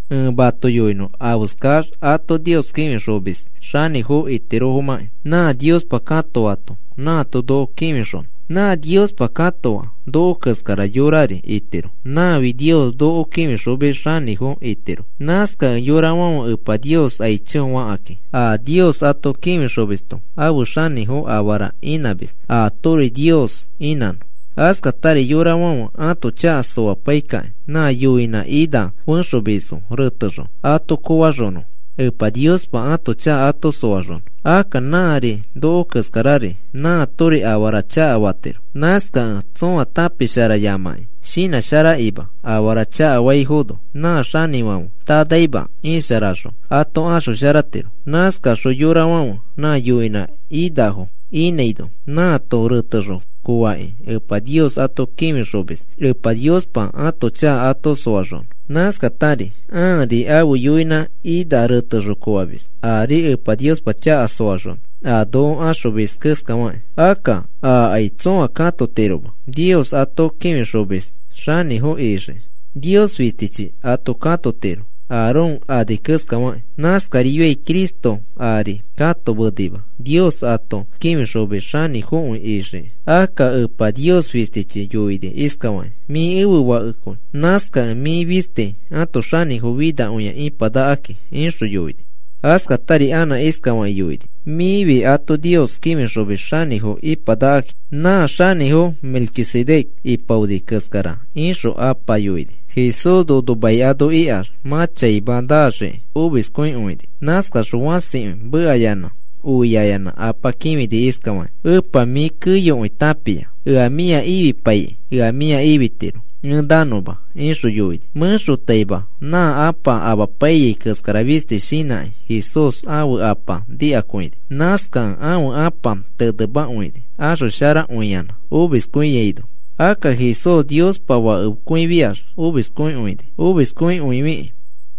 Ẽ mato yoinõ afeskax ato Nios kĩfixomis xanĩfo itirofomãki. Nã Niospa ato katoato nãato noko kĩfixonõ. Nã Niospa katoa noko keskara yorari itiro. Nãfi Nios noko kĩfixomis xanĩfo itiro. Nãskakẽ yorafãfe Epa Nios aicho fakakĩ a Nios ato kĩfixomisto ãfe xanĩfo afara inãmis atori Nios inãnõ. Askatari yorafãfe ãto chaka soapaikakĩ nã yoinã ina fexomisfo retexõ ato koofaxonõ Epa Niospa ãto chaka ato soaxonõ. Akka nãri noko keskarari nãatori afara chakafatiro. Nãskakẽ tsõa tãpisharayamakĩ, shinãsharakima afara chakafaino, nã xanĩfãfe tanaima isharaxõ ato axosharatiro. Nãskaxõ yorafãfe nã yoinã inafo inãino nãato retexõ koofakĩ Epa Nios ato kĩfixomis Epa Niospa ãto chaka ato soaxonõ. Nãskatari ãri ãfe yoinã ina retexõ koofamis ari Epa Niospa chaka soaxonõ, a noko axomis keskafakĩ. Akka ãkai tsoa katometiroma Nios ato kĩfixomis xanĩfo ixii. Nios fistichi ato katotiro Aarón ani keskafakĩ. Nãskarifiai Cristo aari katomenima Nios ato kĩfixomis xanĩfokõi ixiki. Akka Apa Nios fistichi yoini iskafakĩ: Mĩ ẽfe Fakekõi. Nãskakẽ mĩ fisti ãto xanĩfo finakõia ipanakaki, ixõ yoini. Askatari anã iskafakĩ yoini: Mĩfi ato Nios kĩfixomis xanĩfo ipanakaki, nã xanĩfo Melquisedec ipaoni keskara, ixõ Apa yoini. Jesús nono mai ano ikax, mã chaima naxiki omiskõikõini. Nãskaxõ fãsikõi mekayanã oiaiyanã Apa kĩfini iskafakĩ: “Epa, mĩ keyokõi tãpia. Ea mĩa ifipaikĩ ea mĩa ifitiro ẽ nanõma,” ixõ yoini. Mẽxotaima nã Ãpa amapaiyai keskara fisti shinãkĩ Jesús ãfe Apa nikakõini. Nãskakẽ ãfe Ãpa tenemakõini axosharakõiyanã omiskõiaino. Akka Jesús Niospa Fakekõifiax omiskõini. Omiskõifikĩ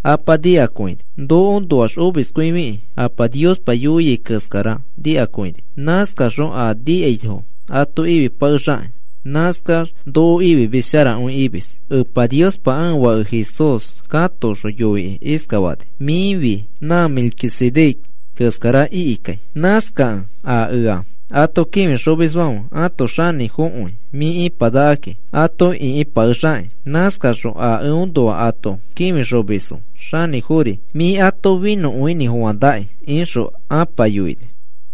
Apa nikakõini. Nokoõnoax omiskõifikĩ Apa Niospa yoiai keskara nikakõini. Nãskaxõ a nikaifo ato ifipakexakĩ. Nãskax noko ifimis sharakõi imis. Epa Niospa ãfe Fake Jesús katoxõ yoikĩ iskafani: “Mĩfi nã Melquisedec keskara ikikai. Nãskakẽ a ea ato kĩfixomisfãfe ãto xanĩfokõi mĩ ipanakaki ato ĩkipakexakĩ. Nãskaxõ a eõnoa ato kĩfixomisfo xanĩfofori mĩ ato finõkõinĩfofãnakĩ,” ixõ Ãpa yoini.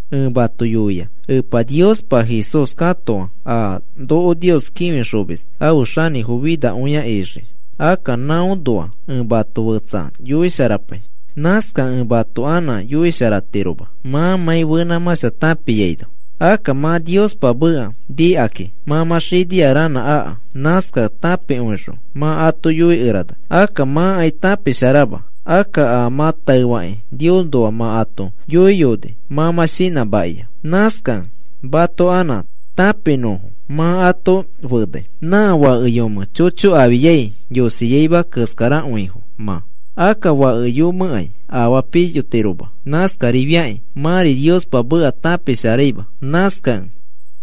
Ẽ mato yoia Epa Niospa Jesús katoa a noko Nios kĩfixomis afe xanĩfo finakõia ixii. Akka nãõnoa ẽ mato fetsa yoisharapai. Nãskakẽ ẽ mato anã yoisharatiroma mãmãi fenãmãshta tãpiaino. Akka mã Niospa meka nikakĩ mã mã xinia ranã aka. Nãskakẽ tãpikõixõ mã ato yoikerana. Akka mãkai tãpisharama. Akka a mã taefakĩ Niosnoa mã ato yoiyoni mã mã shinãmakia. Nãskakẽ mato anã tãpimanõfo mã ato fenai. Nã fake yome chocho afiai yosiaima keskarakõifo, mã. Akka fake yomẽkai afaa piyotiroma. Nãskarifiakĩ mãri Niospa meka tãpisharaima. Nãskakẽ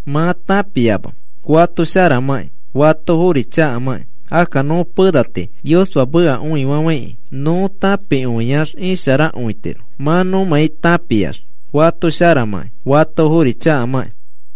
mã tãpiama fato sharamãkĩ fatofori chakamakĩ. Akka nõ pena tii Niospa meka õifafãikĩ nõ tãpikõiax isharakõitiro mãmãi nõ tãpiax fato sharamãki, fatofori chakamãki.